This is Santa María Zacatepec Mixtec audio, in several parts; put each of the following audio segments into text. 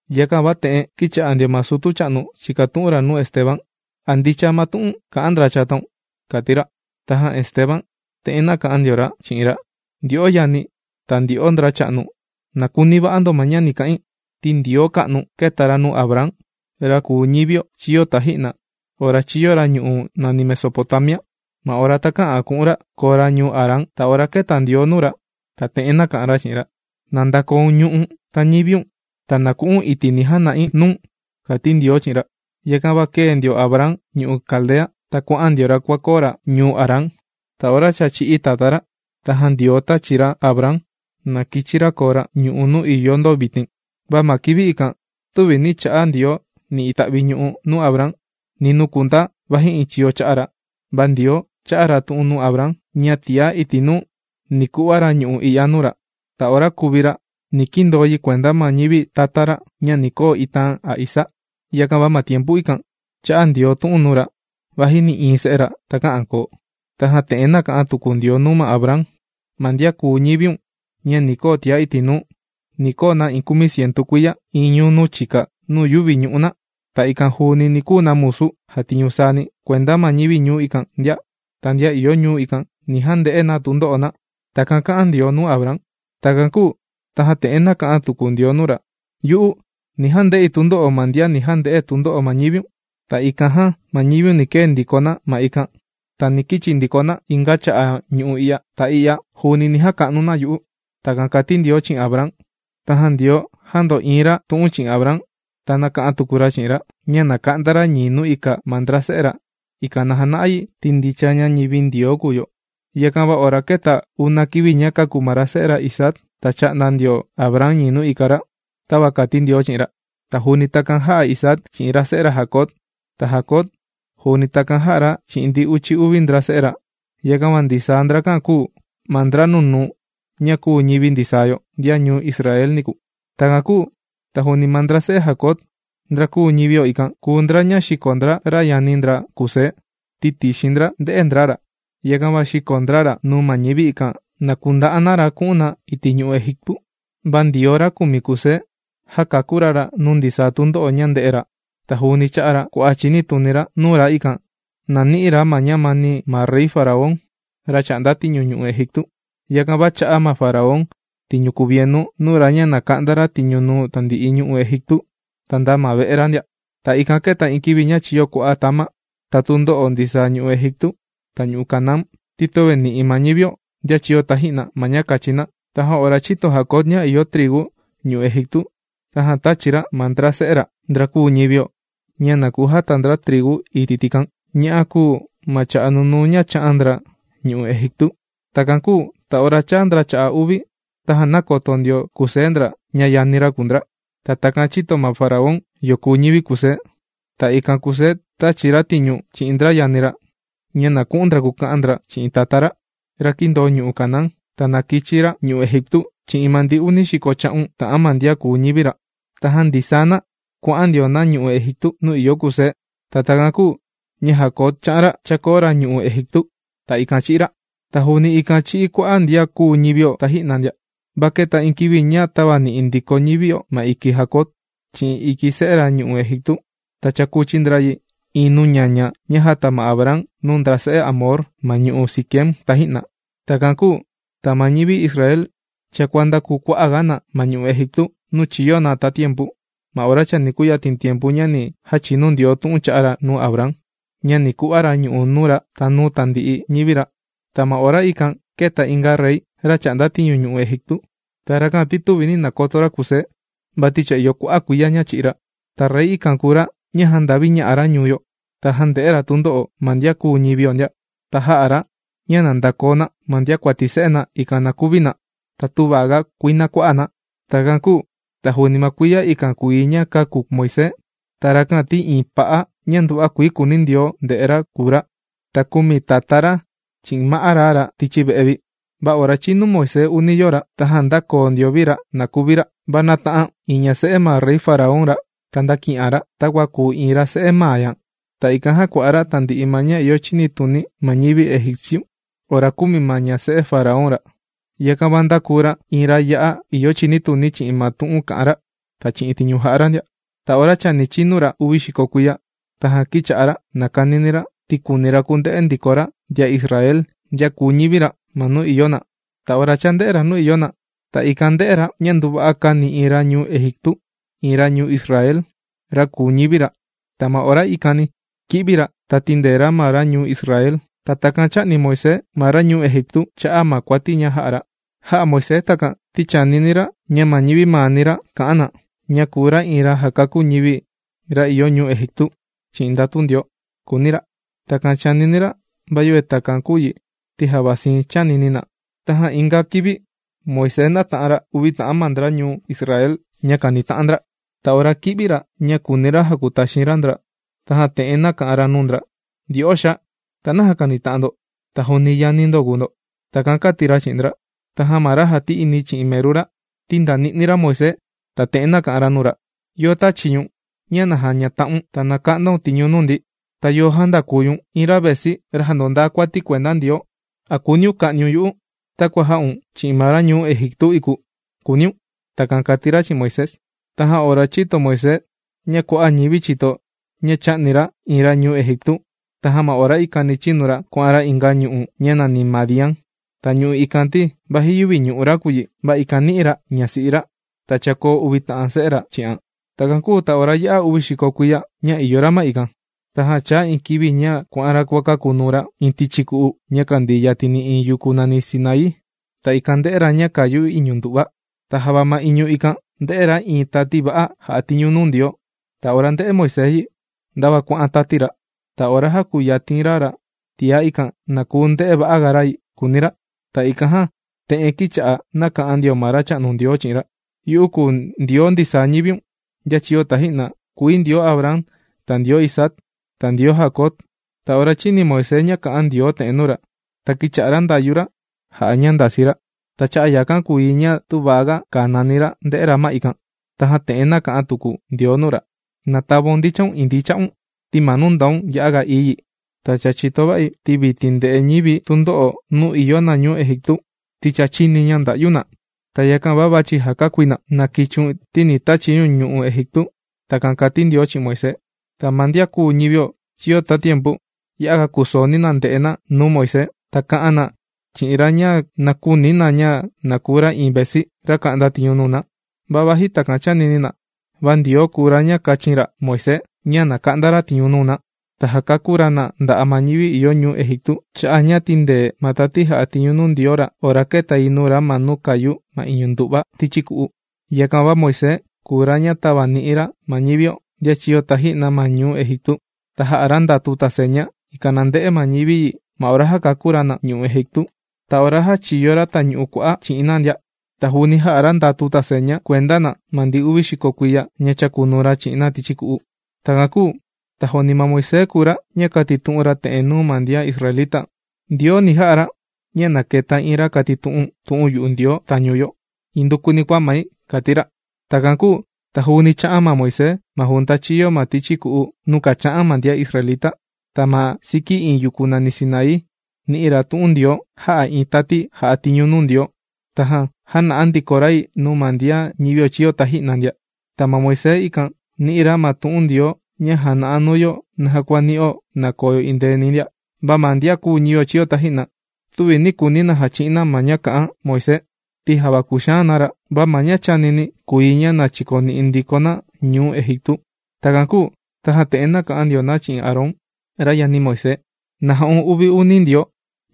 Yakan va te'en kīcha'a ndio ma sutu cha'nu chìkatu'un ra nuu Esteban: ―¿A ndicha ma tu'un kà'an ndra chataun? ―kàti ra. Tajan Esteban te'en nāka'an ndio ra chi'in ra: ―Ndyo'o yani̱ ta ndyo'o ndracha'nu, ¡na kuni va'a ndo ña ni ka'in! Ti Ndioo ka'nu kēta ra nuu Abraham, ra kùu ñivio chīyo taji'na ora chīyo ra ñu'u' nàni Mesopotamia, ma ora takä'an ku'un ra koo ra ñuu Harán. Ta ora kēta Ndioo nuu ra ta te'en nāka'an ra chi'in ra: “Na ndakoun ñu'u̱n ta ñiviun, ta na ku'u̱n iti' ni jana'i nuu̱n”, kàti Ndioo chi'in ra. ’Yakan va kēe ndio Abraham ñu'u' Caldea, ta kuà'an ndio ra kuàkoo ra ñuu Harán. Ta ora cha chī'í tatá ra, tajan Ndioo tāchi ra Abraham na kichi ra koo ra ñu'u' nuu ìyo ndo vitin. Va ma kivi ikan tüvi nī cha'a Ndioo ni ita'vi ñu'u' nuu Abraham ni nuu kundaa, vaji iin chiyo cha'a ra. Va Ndioo chā'a ra tu'un nuu Abraham ña tiá iti' nuu ni ku'va ra ñu'u' i'ya nuu ra. Ta ora kuvi ra ni kindoo yi kuenda ma ñivi tata ra ña ni koo itaan a isaa. Yakan va ma tiempu ikan chā'a Ndioo tu'un nuu ra, vaji nï'iin se'e ra takä'an koo. Tajan te'en nāka'an tuku Ndioo nuu ma Abraham: “Ma ndian kùu ñiviun ña ni koo tiá iti' nuu, ni koo na iin kumicientu kuiya iin ñuu nuu chika nuu yüvi ñu'u' na. Ta ikan juuni ni kuu na musu jàtiñu saani kuenda ma ñivi ñuu ikan ndia. Ta ndian ìyo ñuu ikan, ni jande'e na tundo'o na.” Takan kā'an Ndioo nuu Abraham. Takan kūu tajan te'en nāka'an tuku Ndioo nuu ra: “Yu'u ni jande'i tundo'o ma ndian ni jande'e tundo'o ma ñiviun. Ta ikan jan ma ñiviun ni kee ndiko na ma ikan, ta ni kichi ndiko na inga cha'a' ñu'u' i'ya. Ta i'ya juuni ni jaka'nu na yu'u.” Takan kàti Ndioo chi'in Abraham. Tajan Ndioo jāndo'iin ra tu'un chi'in Abraham, ta nāka'an tuku ra chi'in ra ña na ka'nda ra ñii nuu ika ma ndra se'e ra, ikan na jana'a yi ti ndicha ña ñivi Ndioo kùu yo. Yakan va ora kēta una kivi ña kāku ma ra se'e ra Isaac, ta chā'nda ndio Abraham ñii nuu ika ra, tava kàti Ndioo chi'in ra. Ta juuni takan jā'a Isaac chi'in ra se'e ra Jacob. Ta Jacob juuni takan jā'a ra chi'in ndi uchi uvi ndra se'e ra. Yakan va ndisaa ndrakan kūu ma ndra nunuu ña kūu ñivi ndisaa yo, ndian ñuu Israel niku. ’Takan kūu ta juuni ma ndra se'e Jacob, ndra kūu ñivio ikan, kùu ndra ña xīko ndra ra yani ndra Kusé, ti tixin ndra ndē'e ndra ra. Yakan va xīko ndra ra nuu ma ñivi, ikan na kunda'a na ra ku'un na iti' ñu'u' Egiptu. Va Ndioo ra kùmi Kusé, jākakú ra ra nuu ndisaa tundo'o ña ndē'e ra. Ta juuni chā'a ra kua'a' chinituni ra nuu ra, ikan na ni'i ra ma ñamani ma rey faraón, ra chà'nda tiñu ñu'u' Egiptu. Yakan va chā'a ma ra faraón tiñu kuvienu nuu ra ña na ka'nda ra tiñu nuu tandi'i ñu'u' Egiptu ta nda ma ve'e ra ndia. ’Ta ikan kēta iin kivi ña chīyo kua'a' tama ta tundo'o ndisaa ñu'u' Egiptu ta ñu'u' Canaán, ti töve nì'i ma ñivio, ndian chīyo taji'na, ma ña kachi na. Tajan ora chīto Jacob ña ìyo trigu ñu'u' Egiptu, tajan tāchi ra ma ndra se'e ra, ndra kūu ñivio, ña na kujata ndra trigu iti' tikan. Ña'a kūu ma cha'a' nunuu ña chā'an ndra ñu'u' Egiptu. Takan kūu ta ora chāa ndra cha'a' uvi, tajan nākoto ndio Kusé ndra, ña yani ra kùu ndra. Ta takan chīto ma ra faraón yo kùu ñivi Kusé. Ta ikan Kusé tāchi ra tiñu chi'in ndra yani ra, ña na ku'un ndra kuka'an ndra chi'in tatá ndra, ra kīndoo ñu'u' Canaán, ña na kichi ra ñu'u' Egiptu chi'in ma ndi uni xiko cha'un ta'an ma ndian kùu ñivi ra. Tajan ndisaa na kuà'an ndio na ñu'u' Egiptu nuu ìyo Kusé. Ta takan kūu ña Jacob chā'an ra chākoo ra ñu'u' Egiptu. Ta ikan chī'í ra. Ta juuni ikan chī'í kua'a' ndian kūu ñivio taji'na ndia. Va kēta iin kivi ña tāvani'i ndiko ñivio ma iki Jacob chi'in iki se'e ra ñu'u' Egiptu. Ta chākuchi ndra yi iin nuu ñaña ña jāta ma Abraham nuu ndra se'e Hamor ma ñu'u' Siquem taji'na. ’Takan kūu ta ma ñivi ñuu Israel cha kuàndakuu kua'aga na ma ñu'u' Egiptu nuu chīyo na tatiempu ma ora chani kuyatin tiempu ña ni jachinu Ndioo tu'un chā'a ra nuu Abraham, ña ni ku'va ra ñu'u' nuu ra ta nuu tandi'i ñivi ra. Ta ma ora ikan kēta inga rey, ra chà'nda tiñu ñu'u' Egiptu. Ta rakan ti tüvi nī nakoto ra Kusé, vati cha ìyo kua'a' kuiya ña chī'í ra. Ta rey ikan kùu ra ña jānda'viña'a ra ñuu yo. Ta jānde'e ra tundo'o ma ndian kūu ñivio ndia. Ta jā'a ra ña na ndakoo na ma ndiakuati se'e na, ikan na kuvi na ta tüva ga kuinaa kua'a' na. Takan kūu ta juuni ma kuiya ikan kùu yi ña kāku Moisés. Ta rakan ti iin pa'a ña nduva'a kuii kùuni Ndioo nde'e ra kùu ra. Ta kūmi tatá ra chi'in ma'á ra ra tichi ve'e vi. Va ora chīnu Moisés uni yoo ra, tajan ndākoo ndio vi ra na kuvi ra. Va nāta'an iin ña se'e ma rey faraón ra, ta ndāki'an ra, ta jākua'nuan ra takua kùu iin ra se'e maa ña. Ta ikan jākua'a ra tandi'i ña ìyo chinituni ma ñivi egipciu ora kūmi ma ña se'e ra faraón ra. Yakan va ndākuu ra iin ra ya'a ìyo chinituni chi'in ma tu'un kà'an ra, ta chi'in tiñu jà'a ra ndia. ’Ta ora chani chinu ra uvi xiko kuiya, tajan kīcha'a ra nàkanini ra, ti kùuni ra kunde'e ndiko ra ndian Israel ndian kùu ñivi ra ma nuu ìyo na. Ta ora chānde'e ra nuu ìyo na, ta ikan ndē'e ra ña nduva'a kāni iin ra ñuu Egiptu iin ra ñuu Israel, ra kùu ñivi ra. Ta ma ora ikani kī'vi ra tīndee ra ma ra ñuu Israel. Ta takan chā'ni Moisés ma ra ñuu Egiptu cha'a' ma kuati ña jā'a ra. Jā'a Moisés takan, ti chànini ra ña ma ñivi maani ra ni ka'an na ña kùu ra iin ra jàkakú ñivi ra ìyo ñuu Egiptu chi'in ndatu Ndioo, kùuni ra. Takan chànini ra, va yöve takan kūu yi ti java siin chānini na. Tajan inga kivi Moisés nāta'an ra uvi ta'an ma ndra ñuu Israel ña kànita'an ndra. Ta ora kī'vi ra ña kūuni ra jakutaxin ra ndra, tajan te'en nāka'an ra nuu ndra: “Ndyo'o xaa, ta, ¿naja kànita'an ndo, ta juuni yani ndo kùu ndo?” Takan kāti ra chi'in ndra. Tajan ma ra jàti'ini chi'in meru ra, tīndani'ni ra Moisés ta te'en nāka'an ra nuu ra: “¿Yo tāchi ñu̱n ña na jañata'un ta na ka'ndaun tiñu nuu ndi? ¿Ta yo jāndaku ñu̱n iin ra vesi, ra jàndondaa kuati kuenda Ndioo? ¿A kùuniun ka'niun yu'u takua jā'un chi'in ma ra ñuu Egiptu iku?, kùuniun.” Takan kāti ra chi'in Moisés. Tajan ora chīto Moisés ña kua'a' ñivi chīto ña chā'ni ra iin ra ñuu Egiptu, tajan ma ora ikani chīnu ra kuà'an ra inga ñu'u' ña nàni Madián. Ta ñu'u' ikan ti, vaji yüvi ñu'u' ra kùu yi, va ikan nī'i ra ñasi'i ra. Ta chākoo uvi ta'an se'e ra chi'an. ’Takan kūu ta ora yā'a uvi xiko kuiya ña ìyo ra ma ikan, tajan chāa iin kivi ña kuà'an ra kuàkakunuu ra iin tichi ku'u ña kàndii yatini iin yuku nàni Sinaí. Ta ikan ndē'e ra ña kàyu iñu ndu'va. Ta java ma iñu ikan ndē'e ra iin tati va'a jà'a tiñu nuu Ndioo. Ta ora ndē'e Moisés yi, ndava kuà'an tati ra. Ta ora jākuyatin ra ra tiá, ikan na kuu nde'e va'aga ra yi, kùuni ra. Ta ikan jan te'en kīcha'a nàka'an ndio ma Racha'nu Ndioo chi'in ra: “Yu'u kùu Ndioo ndisaa ñiviun, ndian chīyo taji'na. Kùi Ndioo kùmi Abraham, ta Isaac, ta Jacob.” Ta ora chīni Moisés ña kà'an Ndioo te'en nuu ra, ta kīcha'a ra ndàyu ra jà'a ña ndasii ra. Ta cha'a' yakan kùu yi ña tüva ga kanani ra nde'e ra ma ikan. Tajan te'en nāka'an tuku Ndioo nuu ra: “Na tavaun ndichan indii cha'un, ti ma nuu ndaun ya'aga ií yi. Ta cha chìto va'i, ti vitin ndè'e ñivi̱ tundo'o nuu ìyo na ñuu Egiptu, ti cha chīni̱ ña ndà'yu na. Ta yakan va vàchi̱ jàkakúi na. ¡Na kichiun ti ni tachi̱ ñu̱n ñu'u' Egiptu!” Takan kàti Ndioo chi'in Moisés. ’Ta ma ndian kūu ñivio chīyo tatiempu ya'aga kūsooni na nde'e na nuu Moisés, ta kā'an na chi'in ra ña na küuni na ña na kuu ra iin vesi, ra ka'nda tiñu nuu na. Va vaji takan chānini na, va Ndioo kùu ra ña kāchin ra Moisés ña na ka'nda ra tiñu nuu na, ta jakakú ra na nda'a' ma ñivi ìyo ñuu Egiptu cha'a' ña tīndee ma tati jà'a tiñu nuu Ndioo ra ora kēta yi nuu ra ma nuu kàyu ma iñu ndu'va tichi ku'u. Yakan va Moisés kùu ra ña tāvani'i ra ma ñivio, ndian chīyo taji'na ma ñuu Egiptu. Ta jā'a ra ndatu ta seña, ikan na nde'e ma ñivi yi ma ora jākakú ra na ñu'u' Egiptu, ta ora jāchiyo ra Tañu'u Kua'á chi'in na ndia. Ta juuni jā'a ra ndatu ta seña kuenda na ma ndi uvi xiko kuiya ña chākunuu ra chi'in na tichi ku'u. Takan kūu ta juuni ma Moisés kùu ra ña kātitu'un ra te'en nuu ma ndian israelita: “Ndioo ni ja'a ra ña na keta iin ra kàtitu'un tu'un yu'u Ndioo tañu yo, indukuni kua mai”, kàti ra. Takan kūu ta juuni chā'an ma Moisés ma junta chīyo ma tichi ku'u nuu kàcha'an ma ndian israelita. Ta ma siki iin yuku nàni Sinaí nī'i ra tu'un Ndioo jā'a iin tati jà'a tiñu nuu Ndioo, tajan jāna'a ndiko ra yi nuu ma ndian ñivio chīyo taji'na ndia. Ta ma Moisés ikan nī'i ra ma tu'un Ndioo ña jàna'a nuu yo naja kua nì'o na koo yo endeeni ndia. ’Va ma ndian kùu ñivio chīyo taji'na, tüvi nī kuuni na jachi'in na ma ña kā'an Moisés. Ti java kūxaan na ra, va ma ña chānini na kùu yi ña na chikoni'i ndiko na ñuu Egiptu. Takan kūu tajan te'en kà'an ndio na chi'in Aarón, ra yani Moisés: “¡Na ja'un uvi uni ndioo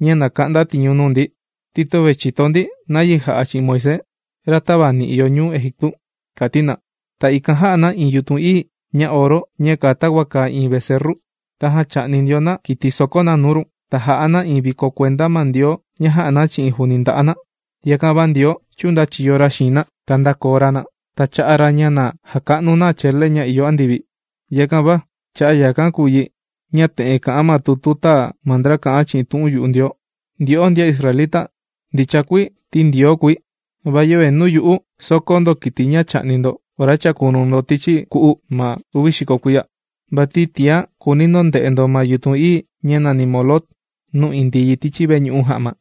ña na ka'nda tiñu nuu ndi, ti töve chìto ndi nayi jà'a chi'in Moisés, ra tāvani'i yo ñuu Egiptu!”, kàti na. Ta ikan jā'a na iin yutun ií ña oro ña kàa takua kàa iin vecerru. Tajan chà'ni ndio na kiti ña sòkó na nuu run, ta jà'a na iin viko kuenda ma ndioo ña jā'a na chi'in juuni nda'a' na. Yakan va Ndioo chūndachiyo ra xiin na, ta ndākoo ra na, ta chā'a ra ña na jaka'nu na chele ña ìyo andivi. Yakan va cha'a' yakan kùu yi ña te'en kà'an ma tutu tāa ma ndra kà'an chi'in tu'un yu'u Ndioo: Ndyo'o ndian israelita, ndicha kuii ti Ndioo kùi, va yöve nuu yu'u, sōkó ndo kiti ña chà'ni ndo ora chàkunuu ndo tichi ku'u ma uvi xiko kuiya. Vati tiá kùuni ndo nde'e ndo ma yutun ií ña nàni Moloc nuu indii yi tichi veñu'u ja'ma.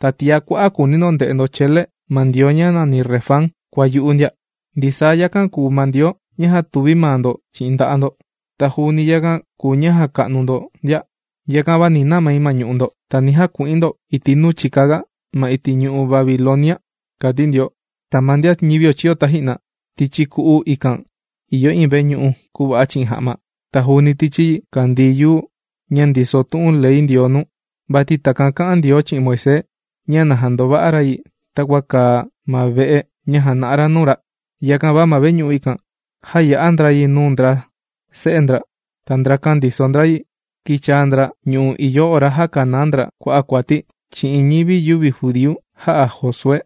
Ta tiá kua'a' kùuni ndo nde'e ndo chele ma ndioo ña nàni Refán kua yu'u ndia. Ndisaa yakan kùu ma ndioo ña jātuvi maa ndo chi'in nda'a' ndo. Ta juuni yakan kùu ma ña jàka'nu ndo ndia. Yakan va ni namai ma ñu'u' ndo. Ta ni jaku'in ndo iti' nuu chika ga ma iti' ñu'u' Babilonia, kàti Ndioo. ’Ta ma ndian ñivio chīyo taji'na, tichi ku'u ikan ìyo iin veñu'u kùva'a chi'in ja'ma. Ta juuni tichi yi kàndii yuu ña ndiso tu'un ley Ndioo nuu. Vati takan kā'an Ndioo chi'in Moisés ña na jandova'a ra yi takua kàa ma ve'e ña jàna'a ra nuu ra. Yakan va ma veñu'u ikan, jāya'a ndra yi nuu ndra se'e ndra. Ta ndrakan ndiso ndra yi, kīchaa ndra ñu'u' i'ya ora jākanaa ndra kua'a' kuati chi'in ñivi yüvi judíu jā'a Josué.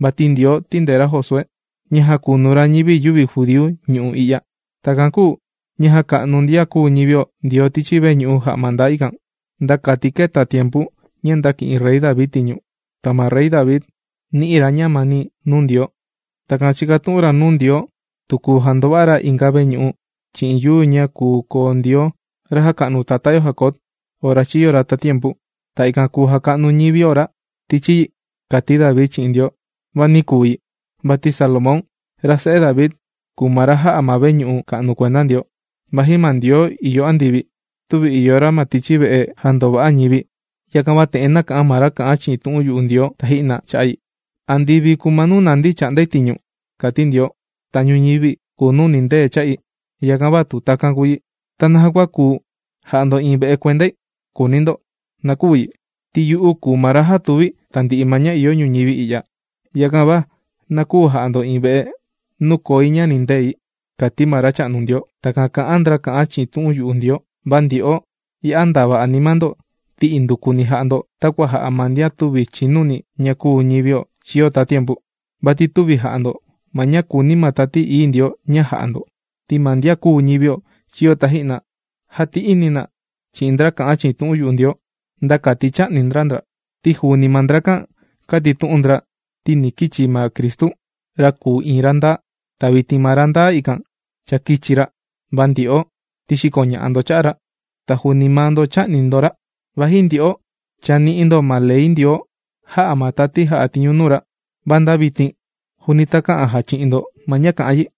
Vati Ndioo tīndee ra Josué, ña jākunu ra ñivi yüvi judíu ñu'u' i'ya. Takan kūu ña jàka'nu ndian kūu ñivio Ndioo tichi veñu'u ja'ma ndaa ikan, nda kati kēta tiempu ña ndāki'in Rey David tiñu. Ta ma Rey David, nī'i ra ñamani nuu Ndioo. Tajan chīkatu'un ra nuu Ndioo tu kuu jandova'a ra inga veñu'u chi'in yuu ña kùu koo Ndioo ra jāka'nu tatá yo Jacob ora chīyo ra tatiempu. Ta ikan kùu jaka'nu ñivio ra tichi yi, kàti David chi'in Ndioo. Va nī kuu yi. Vati Salomón, ra se'e David, kùu ma ra jā'a ma veñu'u ka'nu kuenda Ndioo. Vaji ma Ndioo ìyo andivi, tüvi ìyo ra ma tichi ve'e jàndova'a ñivi, yakan va te'en nāka'an ma ra kà'an chi'in tu'un yu'u Ndioo taji'na cha'a' yi: Andivi kùu ma nuu nandi̱ chà'ndai tiñu, kàti Ndioo. Ta ñuñivi kùu nuu nìndee cha'i. Yakan va tu takan kùu yi, ¿ta naja kua kuu ja'a ndo iin ve'e kuendai?, kùuni ndo. ¡Na küu yi! Ti yu'u kùu ma ra jātuvi tandi'i ma ña ìyo ñuñivi i'ya, yakan va na küu ja'a ndo iin ve'e nuu koi ña nìndei, kàti ma Racha'nu Ndioo. Takan kà'an ndra kà'an chi'in tu'un yu'u Ndioo. ’¡Va ndyo'o ya'a ndava anima ndo, ti indukuni jà'a ndo takua jà'a ma ndian tüvi chìnuni ña kūu ñivio chīyo tatiempu! Vati tüvi jà'a ndo ma ña kùuni ma Tati Ií Ndioo ña jà'a ndo. Ti ma ndian kūu ñivio chīyo taji'na, jāti'ini na chi'in ndra kà'an chi'in tu'un yu'u Ndioo, nda kati chā'ni ndra ndra. Ti juuni maa ndrakan kātitu'un ndra ti ni kichi ma Cristu, ra kùu iin ra ndaa. Ta vitin ma ra ndaa ikan, cha kīchi ra, va ndyo'o, ti xīkoña'a ndo cha'a' ra, ta juuni maa ndo chā'ni ndo ra. Vaji ndyo'o cha nī'i ndo ma ley Ndioo jā'a ma tati jà'a tiñu nuu ra, va nda vitin juuni takä'an jachi'in ndo ma ña kà'an yi.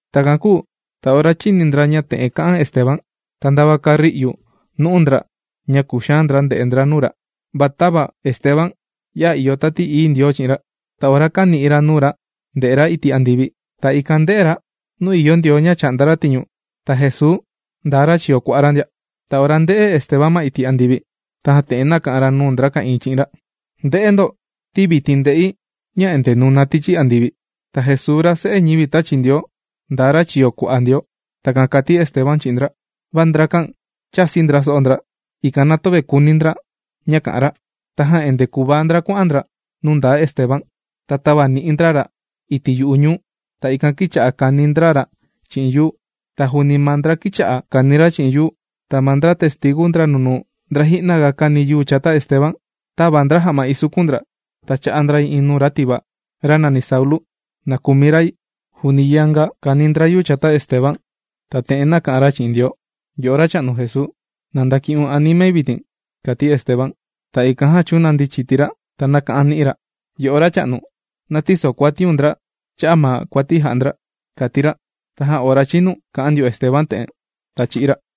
Takan kūu ta ora chīni ndra ña te'en kā'an Esteban, ta ndava kāri'u nu'u ndra ña kūxaan ndra nde'e ndra nuu ra. Va tava Esteban ya'a ìyo Tati Ií Ndioo chi'in ra. Ta ora kāni'i ra nuu ra ndè'e ra iti' andivi, ta ikan ndē'e ra nuu ìyo Ndioo ña chà'nda ra tiñu, ta Jesuu ndaa ra chiyo kua'a ra ndia. Ta ora ndē'e Esteban ma iti' andivi, tajan te'en nāka'an ra nuu ndra ka'ìin chi'in ra: ―¡Nde'e ndo! Ti vitin ndè'i ña endee nùna tichi andivi. Ta Jesuu ra Se'e ñivi tāchi Ndioo, ndaa ra chiyo kua'a Ndioo. ―Takan kāti Esteban chi'in ndra. Va ndrakan chāsi ndra so'o ndra, ikan na töve kuni ndra ña kà'an ra. Tajan endee kùvaa ndra kuà'an ndra nuu ndaa Esteban. Ta tāvani'i ndra ra iti' yu'u ñuu, ta ikan kīcha'a kàni ndra ra chi'in yuu. Ta ma ndra testigu ndra nunuu ndra ji'na ga kāni yuu chata Esteban, tāva ndra ja'ma ìsukun ndra, ta chā'a ndra yi nuu iin ra tivaa, ra nàni Saulu, na kumi ra yi. Juuni yanga kāni ndra yuu chata Esteban, ta te'en nāka'an ra chi'in Ndioo: ―¡Yo'o Racha'nu Jesuu, na ndaki'un animai vitin! ―kàti Esteban. Ta ikan jan chūnandi chiti ra ta nāka'an ni'i ra: ―¡Yo'o Racha'nu na tïsokuatiun ndra cha'a' ma kuati jà'a ndra! ―kàti ra. Tajan ora chinu kà'an ndio Esteban te'en, ta chī'í ra.